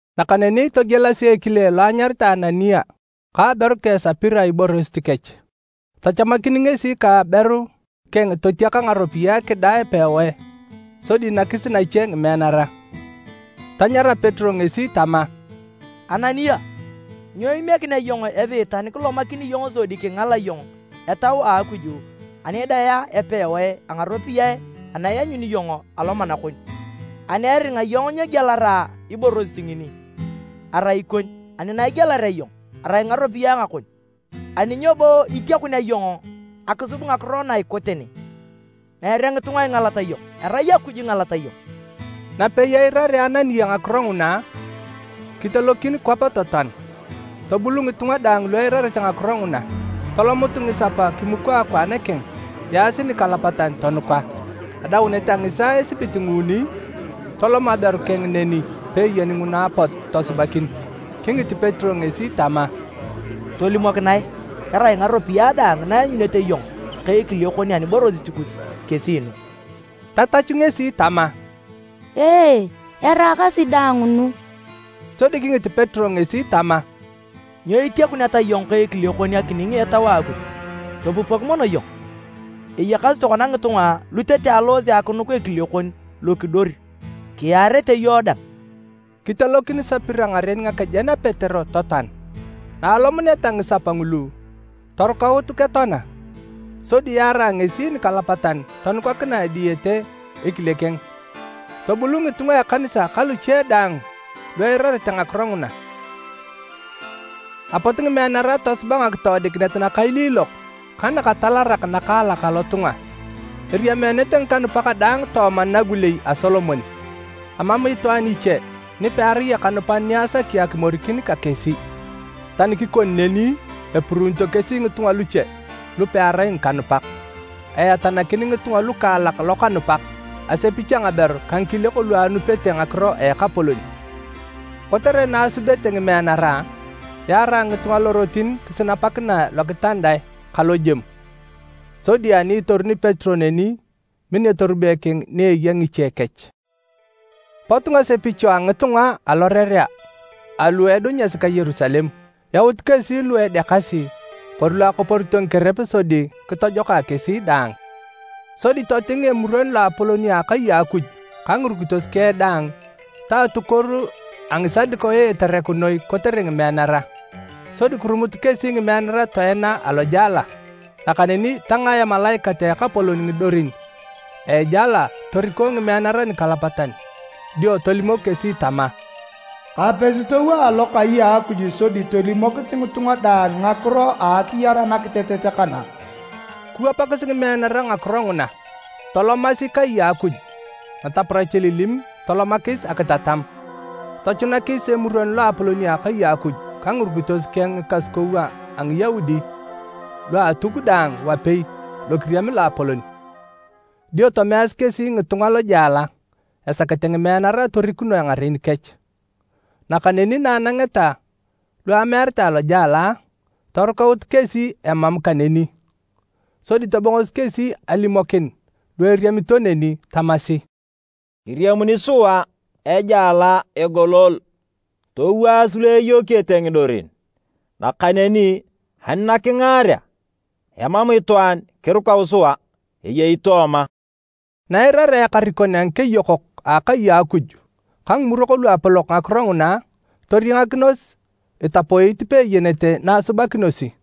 Nakaneni togielasi ekile lo anyaritae Anania ka aberu keng Sapira iborosit kech. Tachamakin ngesi ka aberu keng totiaka ngaropiyae kidaa epewae sodi nakis nache ngimeanara. Tanyara Petero ngesi tama, “Anania, nyo imiekinea iyong Esiitan kilomakini iyong sodi kingala iyong Etau a Akuj ani idaea epewae a ngaropiyae ana ianyuni iyong alomana kon? Ani eringa iyong nyegielara iborosit ngini, arai ikon, ani na igielarea iyong, arai ngaropiyae ngakon. Ani nyo bo itiakunea iyong akisub ngakiro na ikote ne? Meere ngitunga ingalat iyong, erai Akuj ingalat iyong!” Napei eirarea Anania ngakiro nguna, kitelokin kwap totoan. Tobul ngitunga daang lu eirarete ngakiro nguna. Tolomut ngisapa kimuko akwaan keng, yaasi nikalapatan, tonuka. Adaunet a ngisaaa esibit nguuni, tolom aberu keng neni peeyeni nguna apot tosubakin. Kingit Petero ngesi tama, “Tolimokinae kerai ngaropiyae daang na ianyunete iyong ka ekile kon aniborosit kus kesi nu?” Tatachu ngesi tama, “Ee, eraakasi daang nu.” Sodi kingit Petero ngesi tama, “Nyo itiakuneta iyong ka ekile kon akining Etau a Akuj? Topupok mono iyong! Eyakasi tokona ngitunga lu tete aloose akinuk ekile kon lokidor kiyaarete iyong dang!” Kitelokin Sapira ngaren ngakejen a Petero totoan. Naalomuneta ngisapa ngulu, torukaut ketoana. Sodi yaarae ngesi nikalapatan tonukakinae diyete ekile keng. Tobul ngitunga a ekanisa ka luche daang lu eirarete ngakiro nguna. Apot ngimeanara tosuba ngakitoodikinet nakailiilok ka nakatalarak nakaalak alotunga. Eriameenete ngikanupak daang tooma Nagulei a Solomon. Emam itwaan niche ni pearai ekanupan ni asaki akimorikin ka kesi. Tani kikoni neni, epuruunito kesi ngitunga luche lu pearai ngikanupak. Eatanakin ngitunga lukaalak lokanupak, asepich a ngaberu ka ngikiliok lu anupete ngakiro a Ekapolon. Kotere na asubete ngimeanara, yaarae ngitunga lorotin kisinapakinae lokitandae ka lojemu, sodi ani itoruni Petero neni, min etorube keng ni eya ngiche kech. Potu ngasepicho a ngitunga alorerea alu edunyasi ka Yerusalem. Yaut kesi lu edekasi kori lu akoporito ngikerep sodi kitojokae kesi daang. Sodi toting Emuron Loapolon a akai a Akuj ka ngirukitos keng daang, ta atukuoru a Ngisadukayo etereku noi kotere ngimeanara, sodi kirumut kesi ngimeanara toena alojela. Nakaneni tangaa emalaikat a Ekapolon ngidorin a ejela toriko ngimeanara nikalapatan dio tolimok kesi tama, “Kapesi towaa alokai a Akuj sodi tolimokis ngitunga daang ngakiro a akiyar anakitetet kana.” Kiwapakis ngimeanara ngakiro nguna, tolomasi kai a Akuj nataparach elilim tolomakis akitatam. Tochunakis Emuron Loapolon a akai a Akuj ka ngirukitos keng ngikasukou a Ngiyaudi lua Atuk daang wapei lokiriam loapolon. Dio tomeasi kesi ngitunga lojela esakete ngimeanara torikunoe ngaren kech. Nakaneni na anangeta lu amearitae lojela, torukaut kesi emam kaneni. Sodi tobongosi kesi alimokin lu eriemito neni, tamasi, “Kiriamuni sua ejela egolol, towaas lu eyokiyete ngidorin. Nakaneni ani nakingaarea, emam itwaan kirukau sua eyei tooma!” Na eirarea ekarikon a ngikeyokok a akai a Akuj ka Ngimurok Luapolok ngakiro nguna, toriangakinos itapoit peeyenete na asubakinosi.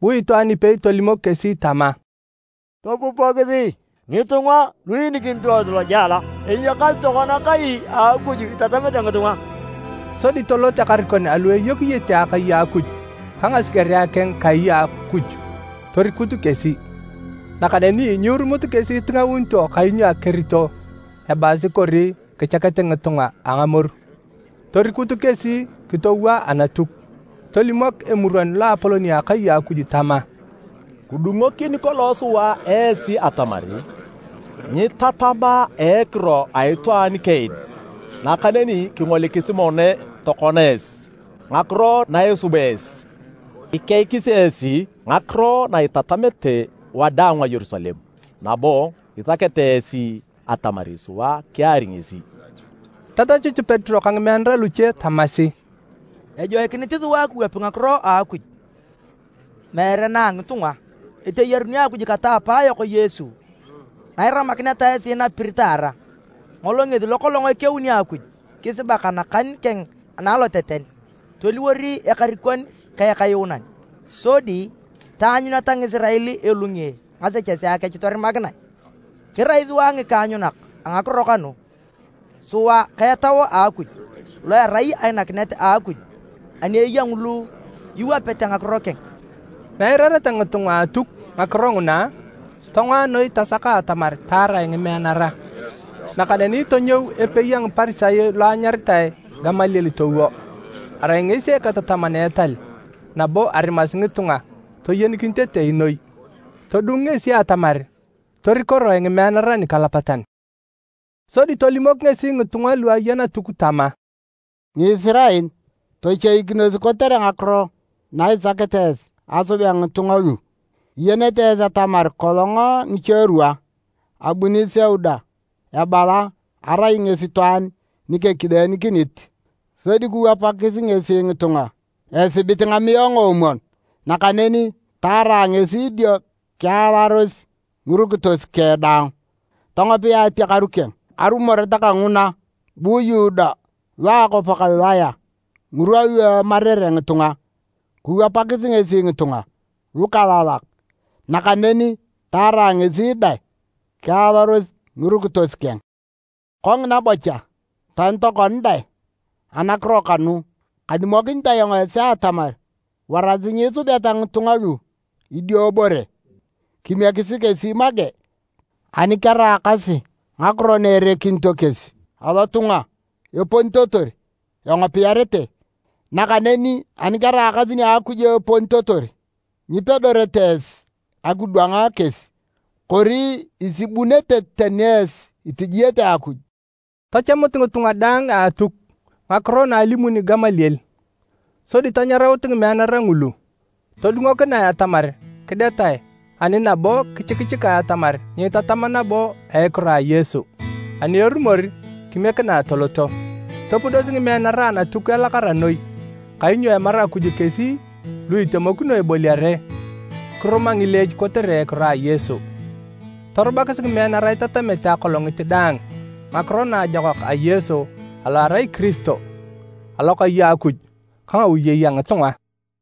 Bu itwaan ipei tolimok kesi tama, “Topupokisi! Ngitunga lu iinikinito esi lojela, eyakasi tokona kai a Akuj itatamete ngitunga!” Sodi tolot ekarikon alu eyokiyete akai a Akuj ka ngasigerea keng kai a Akuj torikut kesi. Nakaneni nyiirumut kesi itingaunito kainyo akerito ebaasi kori kichakete ngitunga a ngamoru. Torikutu kesi kitowaa Anatuk. Tolimok Emuron Loapolon a akai a Akuj tama, “Kidungokini kolong sua esi atamar nyiitatam a ekiro a itwaan kaen, nakaneni kingolikisi mono tokona esi ngakiro na isuba esi! Ikeikis esi ngakiro na itatamete wadaang a Yerusalem, nabo isakete esi atamar sua kiari ngesi!” Tatachut Petero ka ngimeanara luche tamasi, “Ejoikinit sua kiwapi ngakiro a Akuj, meere na a ngitunga. Eteyaruni Akuj kata a apaayok Yesu na iramakineta esi napir taara. Ngolo ngesi lokolong ekeuni Akuj kisibak anakan keng analoteten, toliwor Ekarikon ka Ekayuunan sodi taanyuneta Ngisirael elunge ngasechesea kech torimakinae. Kirai sua ngikaanyunak a ngakiro kanu, sua ka Etau a Akuj, lo erai ainakinet a Akuj ani eya ngulu iwapete ngakiro keng.” Na eirareta ngitunga a Atuk ngakiro nguna, tongoa noi tasaka atamar taarae ngimeanara. Nakaneni tonyou epei a Ngiparisayo lo anyaritae Gamaliel towo, arai ngesi eketataman a etal nabo arimasi ngitunga toyenikinitetei noi. Todungu ngesi atamar torikoroe ngimeanara nikalapatan, sodi tolimok ngesi ngitunga lu aya Natuk tama, “Ngisirael, tochoikinos kotere ngakiro na isakete esi asubea ngitunga lu. Iyenete esi atamar kolong ngicherwa, abuni Seuda ebala arai ngesi itwaan ni kekileenikinit, sodi kiwapakis ngesi ngitunga esibit ngamiae ngoomwon. Nakaneni taarae ngesi dio kialaros ngirukitos keng daang, tongopia atiakaru keng. Arumoret kanguna, bu Yuda lo a akwap a Galilaya ngirwa lu emarere ngitunga, kiwapakis ngesi ngitunga lukaalak, nakaneni taarae ngesi dang kialaros ngirukitos keng. Kongina bocha tani tokona dang anakiro kanu, kalimokinit ayong esi atamar warasi nyiisubeta ngitunga lu idiobore. Kimiekisi kesi make! Ani keraakasi ngakiro na erekinito kesi lotunga eponitotor, engopiarete, nakaneni ani keraakasi nia Akuj eponitotor, nyipedorete esi akidwang kesi. Kori isubunete tani esi itijiete Akuj!” Tachamut ngitunga daang a Atuk ngakiro na alimuni Gamaliel. Sodi tanyaraut ngimeanara ngulu, todungunoe atamar kidetae ani nabo kichikichikae atamar nyiitatam nabo a ekiro a Yesu, ani erumor kimiekinae toloto. Topudosi ngimeanara Anatuk elakara noi kainyo emaru Akuj kesi lu itemokino eboliare kiruma ngileech kotere ekiro a Yesu. Torubakis ngimeanara itatamete akolongit daang ngakiro Naajokak a Yesu alo erai Kiristo, alokai a Akuj ka ngawiyei a ngitunga.